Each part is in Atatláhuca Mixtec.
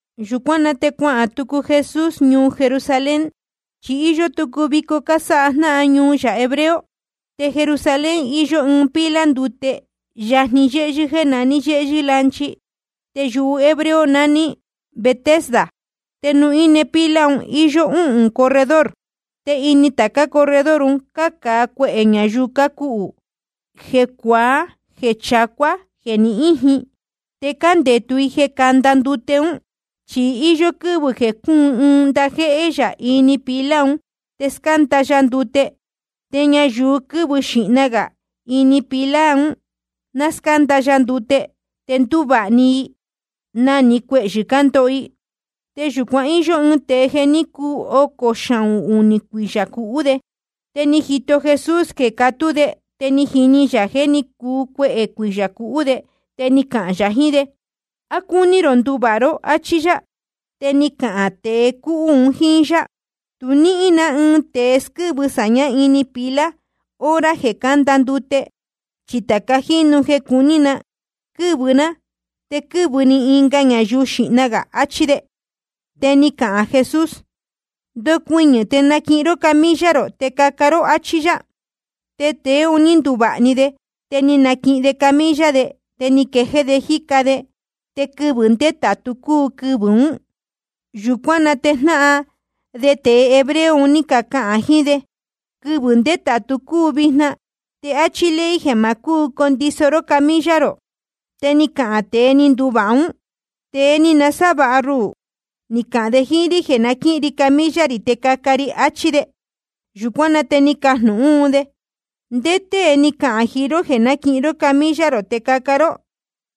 Yūcuán na te cuahān tucu Jesús ñuu Jerusalén, chi íyó tucu vico cásáha jnáhan ñuu yā hebreo. Te Jerusalén iyó ɨɨn pila ndute yajni yéhyɨ́ jéē naní yéhyɨ́ lanchi. Te yuhu hebreo naní Betesda. Te nuū íne pila un íyó úhūn corredor. Te ini tācá corredor un cácāa cuehē ñayuu cácuhū, jeē cuaá, jeē chacuá, jeē ni íjin. Te cándetu i jeē canda ndute ún. Chi íyó quɨ́vɨ̄ jeē cúun ɨɨn ndajéhé yā ini pila un, te scánda ya ndute. Te ñayuu quɨ́vɨ xīhna gā ini pila un ná scánda ya ndute, te ndúvāha i na‑ni cuehyɨ̄ ndóho i. Te yūcuan íyó ɨɨn tēe jeē ní cuu ocō xahūn unī cuiyā cuhú de. Te ni jito Jesús jeē catú de, te ni jini yā jeē ní cuu cuehē cuiyā cuhú de. Te ni cahān yā jiín de: ¿A cúní rō nduvāha ró? áchí yá. Te ni cahān tēe cúhú un jíín yá: Tu níhín na ni ɨɨn tēe squɨ́vɨ sāñá ini pila hora jeē cánda ndute. Chi tāca jínu jeē cuní na quɨ́vɨ ná, te quɨ́vɨ‑ni ɨnga ñayuu xīhna gā. Achí de. Te ni cahān Jesús: Ndocuɨñɨ̄ te naquihin ró camilla rō te caca ró, áchí yá. Te tēe un ní nduvāha‑ni de. Te ni naquihin de camilla de, te ni quejéé de jíca de. Te quɨvɨ̄ ndétātu cúu quɨvɨ̄ ún. Yūcuán na te jnáhan de tēe hebreo un ní cacahān jiín de: Quɨvɨ̄ ndétātu cúu vijna. Te áchí ley jeē ma cúu condiso ró camilla rō. Te ni cahān tēe ni nduvāha ún: Tēe ni nasávāha ruhū, ni cahān de jíín rí jeē náquihin ri camilla rī te caca ri, achí de. Yūcuán na te ni cacajnūhún un de: ¿Ndé tée ni cahān jiín ró jeē náquihin ró camilla rō te caca ró?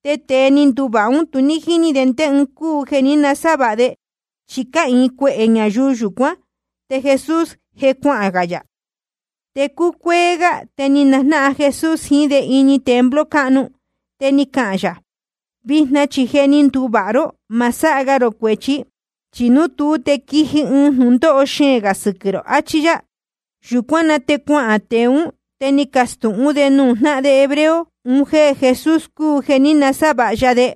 Te tēe ni nduvāha ún, tu jíní de ndé ɨɨn cúu jeē ní nasávāha de. Chi cáhīin cuehē ñayuu yūcuán, te Jesús je cuahān yā. Te cúcuéé gá te ni najnáhan Jesús jiín de ini templo cáhnu. Te ni cahān yā: Vijna chi je ni nduvāha ró. Ma sáha ga rō cuēchi, chi núu tuú, te quiji ɨɨn jnūndóho xeēn gā sɨquɨ̄ rō, achí yá. Yūcuán na te cuahān tēe ún, te ni castūhún de nuū jnáhan de hebreo un jéē Jesús cúu jeē ní nasávāha ya de.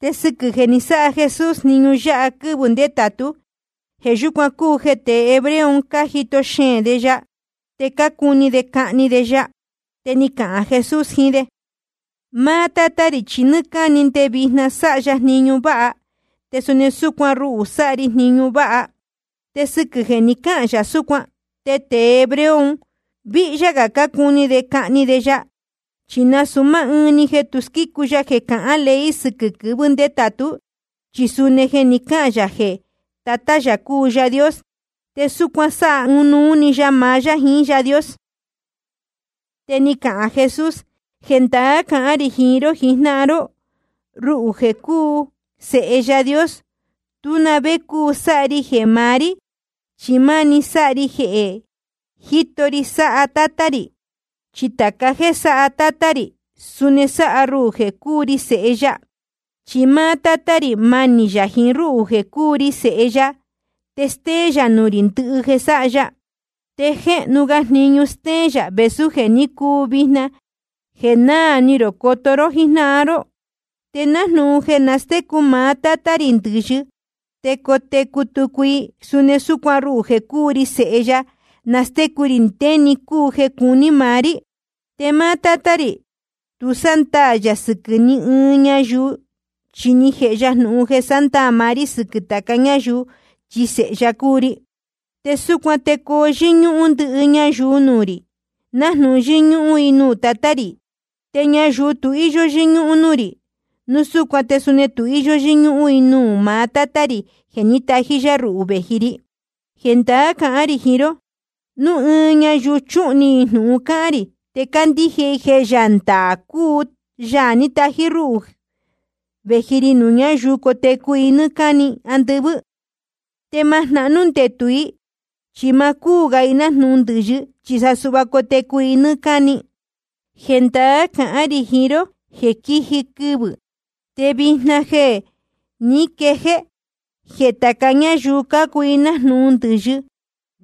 Te sɨquɨ̄ jeē ní sáha Jesús jniñu yáha quɨ́vɨ̄ ndétātú, jeē yúcuan cúu jeē tée hebreo un cájito xeēn de ya, te cácuni de cahni de ya. Te ni cahān Jesús jiín de: Máá Tátá rī chi nɨ́ɨ́ cáni te nde vijna sáha ya jniñu váha, te suni súcuan ruhū sáha ri jniñu váha. Te sɨquɨ̄ jeē ni cáhān yā súcuan, te tēe hebreo un víhyá gā cácuni de cahni de ya. Chi nasūu máá ɨɨn‑ni jeē tu squícu ya jeē cahán ley sɨquɨ̄ quɨvɨ̄ ndétātú, chi suni jeē ni cáhān yā jeē Tatá yā cúu Yaā Dios, te súcuan sáha ɨnuú yá maá yá jiín Yaā Dios. Te ni cahān Jesús: Jendaá cahán rī jiín ró jijnáhan ró: Ruhū jeē cúu Sēhe Yaā Dios, tú na vé cúu sáha ri jeē maá rí, chi máni sáha ri jeē jíto ri sáha Tátá rī. Chi tāca jéē sáha Tátá rī, suni sáha ruhū jeē cúu ri Sēhe ya. Chi máá Tátá rī, manī yā jiín ruhū jeē cúu ri Sēhe ya, te stéén yā nuū rī ndɨhɨ jeē sáha ya. Te jéhnu ga jniñu stéén yā vēsú jeē ní cuu vijna, jeē naa ni rō coto ró jíjnáhan ró. Te nájnūhun jeē nastécu maá Tátá rī ndɨ̄yɨ te cotecu tucu i, suni súcuan ruhū jeē cúu ri Sēhe ya, nástécu rī ndé‑ni cúu jeē cuní maá rí. Te máá Tátá rī, tu sándaā yā sɨquɨ̄ ni ɨɨn ñayuu, chi ni jēhe ya jnūhun jeē sándaā maá rí sɨquɨ̄ tāca ñáyuu, chi Sēhe ya cúu ri. Te súcuan te coo yɨ́ñúhún ndɨhɨ ñayuu nuū rī, nájnūhun yɨ́ñúhún i nuū Tatá rī. Te ñayuu tu íyó yɨ́ñúhún núū rī, núu súcuan te suni tu yɨ́ñúhún i nuū maá Tátá rī jeē ní tají yá ruhū vēji ri. ’Jendaá cahán rī jiín ró: Núu ɨɨn ñayuu chuhun ni i jnūhun cáhán rī, te candíje i jeē Yaā ndaā cúu Yaā ní tají rúhū vēji ri, ñayuu ún cotecu i nɨ́ɨ́ cáni andɨvɨ́, te ma jnahnú ndetū i. Chi ma cúu ga i nájnūhun ndɨ̄yɨ, chi sa suhva cotecu i nɨ́ɨ́ cáni. Jendaá cahán rī jiín ró jeē quiji quɨvɨ̄, te vijna je ni quejéé, jeē tāca ñáyuu cácuu nájnūhun ndɨ̄yɨ,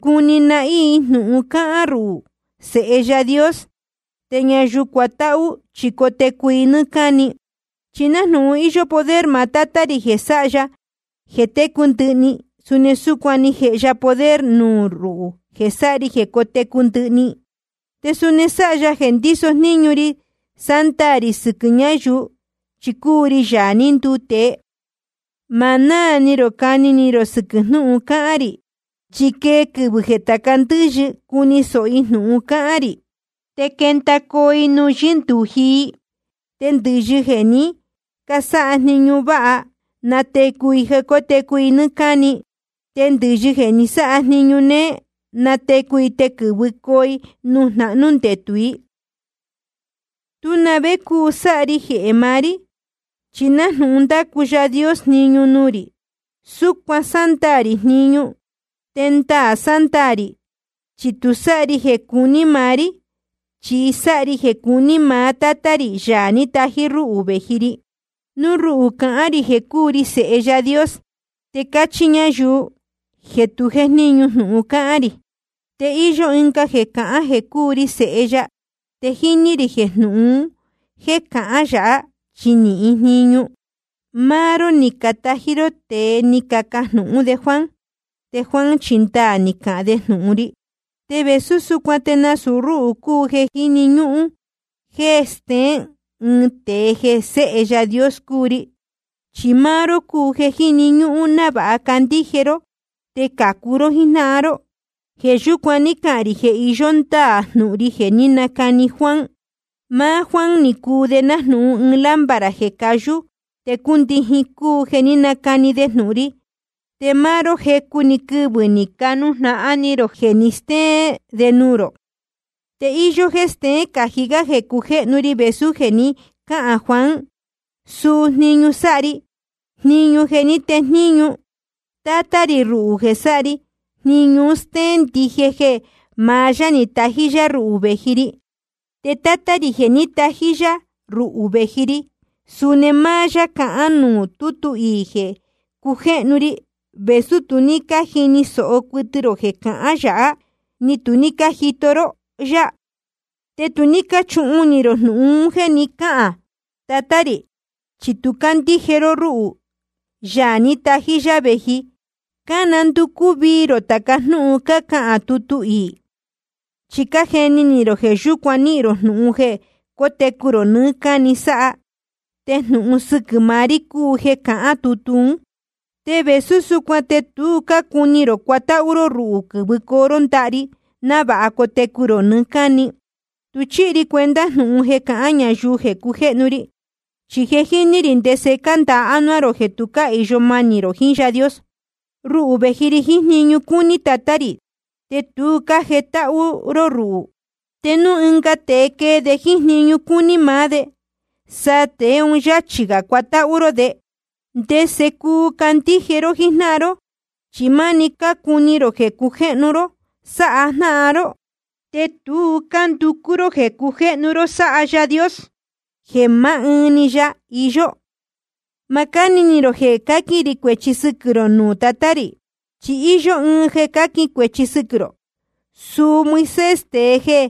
cuni nahín i jnūhun cáhán ruhū, Sēhe Yaā Dios. Te ñayuu cuatáhú, chi cotecu i nɨ́ɨ́ cáni. Chi nájnūhun íyó poder maá Tátá rī jeē sáha ya jeē técu ndɨhɨ‑ni, suni súcuan ni jēhe ya poder nuū ruhū jeē sáha ri jeē cotecu ndɨhɨ‑ni. Te suni ni sáha ya jeē ndíso jníñu ri sándaā rī sɨquɨ̄ ñayuu, chi cúu ri Yaā ní nduu tēe. Ma náā ni rō cani ni rō sɨquɨ̄ jnúhun cáhán rī. Chi quee quɨvɨ̄ jeē tāca ndɨ́yɨ cuni sōho i jnūhun cahān rī, te quendacoo i nuū yɨ́ndūji i. Te ndɨ̄yɨ jeē ní casáha jniñu váha, natecu i jeē cótecu i nɨ́ɨ́ cáni. Te ndɨ̄yɨ jeē ní casáha jniñu néé, natecu i te quɨ̄vɨcoo i nuū jnahnú ndetū i. ’Tú na vé cúu sáha ri jeē maá rí. Chi nájnūhun ndácu Yaā Dios jniñu nuū rī, súcuan sándaā rī jniñu. Te ndaā sándaā rī, chi tu sáha ri jeē cuní maá rí, chi sáha ri jeē cuní maá Tátá rī, Yaā ní tají rúhū vēji ri. Núu ruhū cahān rī jeē cúu ri Sēhe Yaā Dios, te cachi ñayuu jeē tu jéjníñu jnūhun cáhán rī. Te íyó ɨnga jeē cahán jeē cúu ri Sēhe ya. Te jíní rī jeē jnúhun un jéē cahán yā, chi níhín jníñu. Máá ró ni catají ró tēe ni cacajnūhún de Juan. Te Juan chi ndaā ni cahān de jnūhun ri. Te vēsú súcuan te nasūu rúhū cúu jeē jíni ñúhún jeē steén ɨɨn tēe jeē Séhe Yaā Dios cúu ri. Chi máá ró cúu jeē jíni ñúhún návāha candíje ró te cācu ró jíjnáhan ró. Jeē yúcuan ní cahān rī jeē iyó ndáā jnūhun ri jeē ní nacani Juan. Máá Juan ni cuu de nájnūhun ɨɨn lámpara jeē cayú te cúndijin, cúu jeē ní nacani de jnūhun ri. Te máá ró, jecu‑ni quɨvɨ̄ ni canujnahan ni rō jeē ni stéén de nuū rō. Te íyó jéē steén cají gá jeē cujéhnu ri vēsú jeē ni cáhān Juan. Suu jniñu sáha ri, jniñu jeē ní tejníñu Tátá rī ruhū jeē sáha ri, jniñu un stéén ndije jeē maá yá ni tají rúhū vēji ri. Te Tátá rī jeē ní tají yá ruhū vēji ri, suni máá yá cahán nuū tútu iī jeē cujéhnu ri, vēsú tu ní cájini sōho cuɨtɨ rō jeē cahán yā, ni tu ní cájito ró yá. Te tu ní cáchuhun ni rō jnūhun un jéē ni cáhān Tatá rī, chi tu cácandíje ró rúhū, Yaā ní tají yá vēji. Cánanducú vii rō tāca jnúhun cáhán tutu iī, chi cájeni ni rō jeē yūcuan níhīn rō jnūhun jeē cótecu rō nɨɨ́ cáni sáha. Te jnūhun sɨquɨ̄ maá rí cúu jeē cahán tutu ún. Te vēsú súcuan te tu cácuni rō cuatáhú ró ruhū quɨ̄vɨcoo ró ndaha ri návāha cotecu rō nɨɨ́ cáni. ’Tu chíhi ri cuenta jnūhun jeē cácahān ñayuu jeē cujéhnu ri. Chi je jíní rī ndese cándāa ánuá rō jeē tu cáhīyo manī rō jiín Yaā Dios. Ruhū vēji ri jiín jniñu cúní Tatá rī, te tu cájetáhú ró ruhū. Te núu ɨnga tēe quee de jíín jniñu cúní maá de, sa tēe un yáchī cuatáhú ró de. ¿Ndese cuu candíje ró jíjnáhan ró? Chi máni cácuni rō jeē cujéhnu ró sáha jnáhan ró, te tu cánducú ró jeē cujéhnu ró sáha Yaā Dios, jeē maá ɨɨn‑ni ya iyó. Ma cáni ni rō jeē cáquin rī cuēchi sɨquɨ̄ rō nuū Tatá rī. Chi íyó ɨɨn jeē cáquin cuēchi sɨquɨ̄ rō, suu Moisés, tēe jeē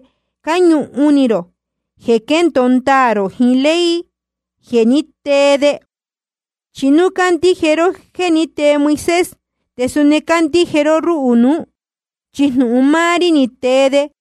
cáñuhun ni rō jeē quendōo ndaā rō jiín ley jeē ní tee de. Chi núu ní cácandíje ró jéē ní tee Moisés, te suni candíje ró rúhū nuú, chi jnūhun máá rí ni tee de.